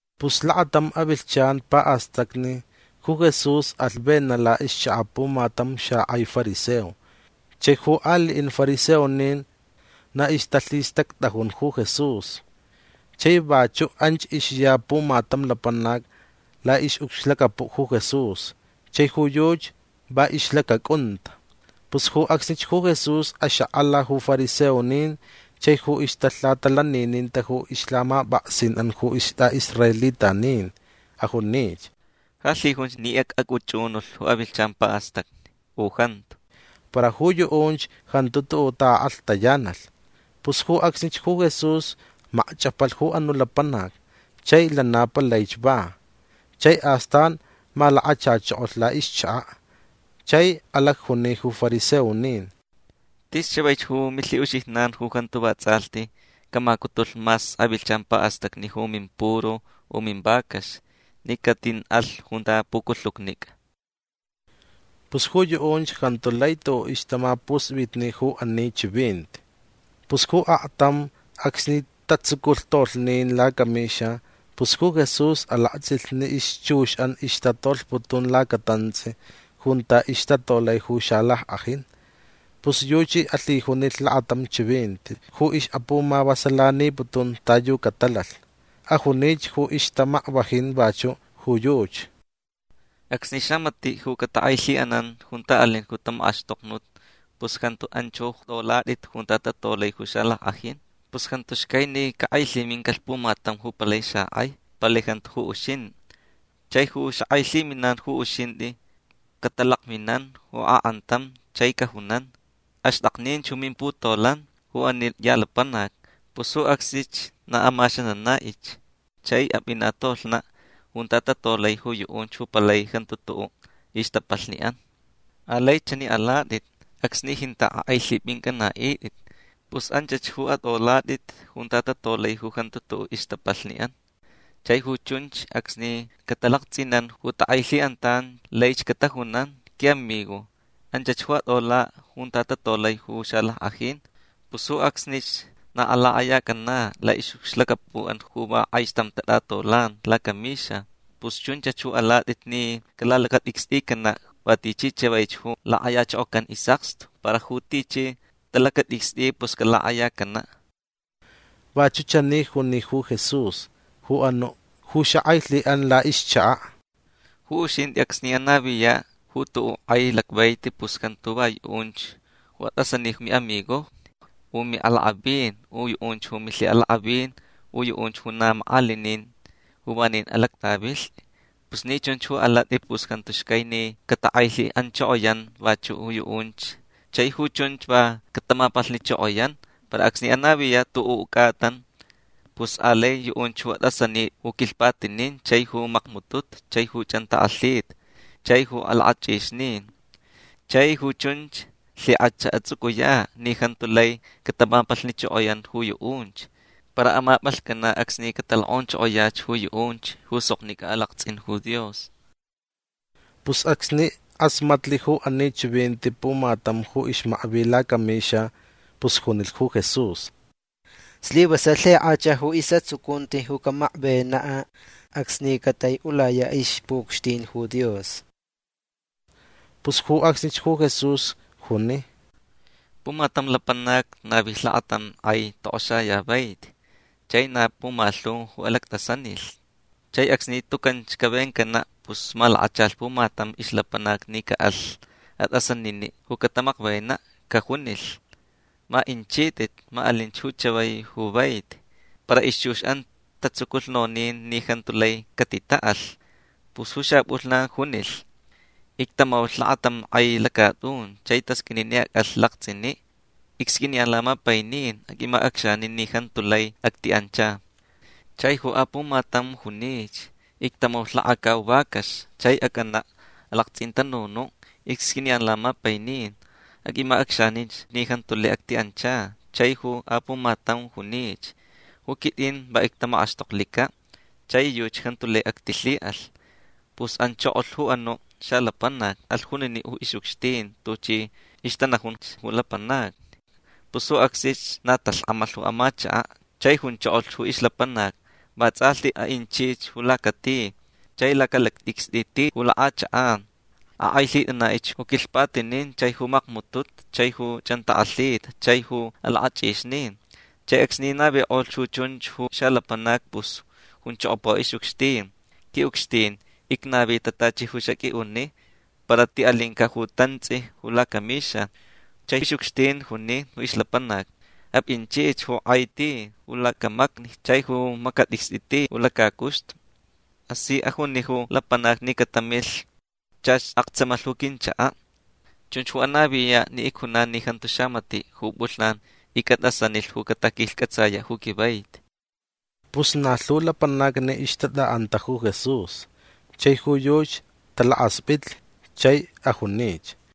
Pus lakatam avilhchan pa'astacni ju Jesús alh vena' la'ixchaka' pumatam xak'ai fariseo. Chai ju ali'in fariseonin na ixtalhistact'ajun ju Jesús. Chai vachu' anch ixya pumatam lapanac la'ix'ucxlacapu' ju Jesús. Chai ju yuchi va ixlacac'unta. Pus ju acsnich ju Jesús axak'ala ju fariseonin chai ju ixtalhatalanininta ju ixlhamap'aksin'an ju ist'a'israelitanin. Ajunich: ―Ja lhijunch ni ac'ac'uch'unulh ju avilhchan pa'astacni u jantu. Para ju yu'unch jantu tu'u' ta'ak'alhtayanalh. Pus ju acsnich ju Jesús macch'apalh ju anu' lapanac chai lana palaich va. Chai astan malakachachokolh la'ixchaka'. Chai alacjuni ju fariseonin: ―Tis chavaich ju milhi'uxijnan ju jantu vats'alhti camacutulh mas avilhchan pa'astacni ju mimpuru u mivacax ni catin'alh junta puculhucnic'a. Pus ju yu'unch jantu lai tu'u' ixtamapusp'itni ju ani chivinti. Pus ju aktam acsni tatsuculh tolhnin lacamixa pus ju Jesús alakts'ilh ni ixchux'an ixtatolhputun lacatants'i junta ixtatolai ju xalack'ajin. Pus yuchi alhijunilh lakatam chivinti ju ix'apumavasalaniputun ta yu catalalh. Ajunich ju ixtamakvajin vachu' ju yuchi: ―Acsni xamati' ju catak'ailhi'anan junta alin ju tamak'axtoknut pus jantu anch ju at'olat'it junta tatolai ju xalack'ajin. Pus jantu xcai ni cak'ailhimincalh pumatam ju palai xak'ai. Palai jantu ju uxint'i. Chai ju xak'ailhiminan ju uxint'i cat'alakminan ju ak'antam chai cajunan: “Axt'akninch ju mimputolan ju ani ya lapanac”. Pus ju acsnich na amaxanana'ich chai ap'ina' tolhna' junta tatolai ju yu'unch ju palai jantu tu'u' ixtapalhni'an. Alai chani alat'it acsni jinta' k'ailhip'inc'ana'it'it. Pus anchach ju at'olat'it junta tatolai ju jantu tu'u' ixtapalhni'an. Chai ju chunch acsni catalakts'inan ju tak'ailhi'antan laich catajunan: “Qui'amigo anchach ju at'ola' junta tatolai ju xalack'ajin”. Pus ju acsnich na alak'ayac'ana' la'ix'ucxlacapu'an ju va k'aixtam tat'atolan lacamixa. Pus chunchach ju alat'it ni calalacat'icst'icana' va tichi chavaich ju lak'ayachokocan is'akstu. Para ju tichi t'alacat'icst'i pus calak'ayacana'. Vachu' chani juni ju Jesús ju anu' ju xak'ailhi'an la'ixchaka': ―Ju uxint'i acsni anaviya' ju tu'u' k'ai lacvaiti pus jantu va yu'unch ju at'asani ju mi'amigojni u mi'alak'avin u yu'unch ju milhi'alak'avin u yu'unch ju na mak'alinin ju vanin alact'avilht'i. Pus ni chunch ju alat'i pus jantu xcai ni catak'ailhi'anchokoyan vachu' ju yu'unch chai ju chunch va catamapalhnichokoyan. Para acsni anaviya' ju tu'u' c'atan pus alai yu'unch ju at'asanit'i ju quilhpatinin chai ju macmututu chai ju ch'antak'alhita chai ju alak'ach'ixnin. Chai ju chunch lhik'ach ats'uc'uya' ni jantu lai catamapalhnichokoyan ju yu'unch. Para amap'alhc'ana' acsni catalok'onchokoyach ju yu'unch ju soknic'a alakts'in ju Dios. Pus acsni k'asmatlh ju ani chivinti pumatam ju ixmakvi lacamixa pus junilh ju Jesús: ―Slivasalh lhik'ach ju is'atsucunti ju camakvena' acsni catai'ulaya' ixpu'ucxtin ju Dios. Pus ju acsnich ju Jesús juni: ―Pumatam lapanac navilh lakatam k'ai tok'oxayavaiti. Chai na pumalhu ju alact'asanilh. Chai acsni tucanch cavencana' pus malakachalh pumatam ixlapanac ni ca'alh at'asanini' ju catamakvena'. Cajunilh: “Ma inchit'it. Ma alinch ju chavai ju vaiti”. Para ixchux'an tatsuculh nonin ni jantu lai catita'alh. Pus ju xap'ulhnan junilh: “Ictamaulh lakatam k'ai lacat'un chai tasq'uini ni ac'alh lakts'ini'. Icsq'uiniyan lamapainin. Aq'uimac'acxanin ni jantu lai acti'ancha”. Chai ju apumatam junich: “Ictamaulh lakacau vacax chai ac'ana' alakts'intanunu'. Icsq'uiniyan lamapainin. Aq'uimac'acxaninch ni jantu lai acti'ancha”. Chai ju apumatam junich: “Ju quit'in va ictamak'axtoklica' chai yuchi jantu lai actilhi'alh”. Pus anchokolh ju anu' xalapanac. Alh junini' ju ix'ucxtin tuchi ixtanajunch ju lapanacni. Pus ju acsnich na talhk'amalh ju amachaka'. Chai junchokolh ju ixlapanac: “Vats'alhti a'inchich ju lacak'ai ti chai lacalact'icst'i ti ju lak'achak'an. Ak'ailhit'ana'ich ju quilhpatinin chai ju macmututu chai ju ch'antak'alhita chai ju alak'ach'ixnin”. Chai acsni navik'olh ju chunch ju xalapanac pus junchokopa ju ix'ucxtin: “Qui'ucxtin icnavita tachi ju xaq'ui'uni para ti'alinca' ju tants'i ju lacamixa”. Chai ix'ucxtin juni ju ixlapanac: “Ap'inchich ju k'ai ti ju lacamacni chai ju macat'icst'i ti ju lacacuxtu. K'asi ajuni ju lapanacni ni catamilh. Chach aktsamalh ju quinchaka'. Chunch ju anaviya' ni icjunan ni jantu xamati' ju p'ulhnan ic'at'asanilh ju caquilhc'atsaya' ju quivaiti”. Pus na lhu lapanacni ixtat'a'anta ju Jesús. Chai ju yuchi talakasp'itlh chai ajunich: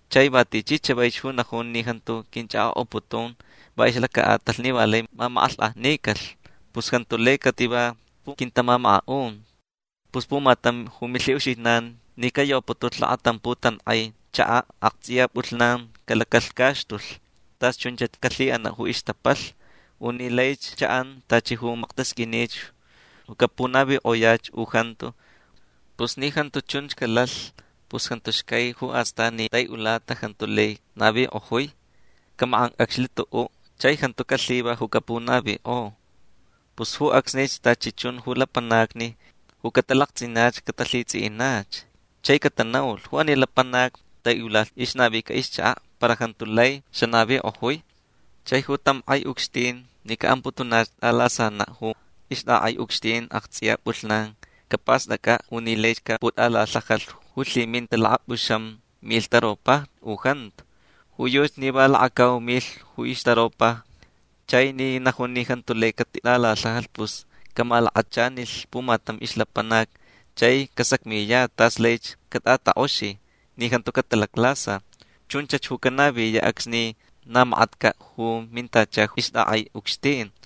Chai va tichi chavaich ju najun ni jantu quinch'ak'ok'aputun va ixlaca'atalh ni va lai mamak'alhk'ajnicalh pus jantu lai cativa ju quintamamaka'un. Pus pumatam ju milhi'uxijnan ni cayoputulh lakatam putank'ai chaka' akts'iya p'ulhnan calacalhcaxtulh tas chunchach calhi'ana' ju ixtapalh. U ni laich cha'an tachi ju maktasq'uinich ju capunavik'oyach u jantu. Pus ni jantu chun calalh pus jantu xcai ju astan ni tai'ulata jantu lai navik'ojui. Camak'anc'acxlh tu'u' chai jantu calhiva ju capunavik'o. Pus ju acsnich tachi chun ju lapanacni ju catalakts'inach catalhits'i'inach. Chai catanaulh: “Ju ani lapanac tai'ulalh ixnavica ixchaka' para jantu lai xanavik'ojui”. Chai ju tam k'ai ucxtin ni ca'amputunach t'alasana' ju ixt'ak'ai ucxtin akts'iya p'ulhnan capast'ac'a' u ni laich caput'alalhajalh ju lhiminta lakap'uxam milh taropajni u jantu. Ju yuchi ni va lakacau milh ju ixtaropajni. Chai ni najun ni jantu lai catit'alalhajalh pus camalakachanilh pumatam ixlapanac chai casacmiyach tas laich cat'atak'oxi ni jantu catalaclasa. Chunch ju canaviya' acsni na makatca' ju mintacha ju ixt'ak'ai ucxtin.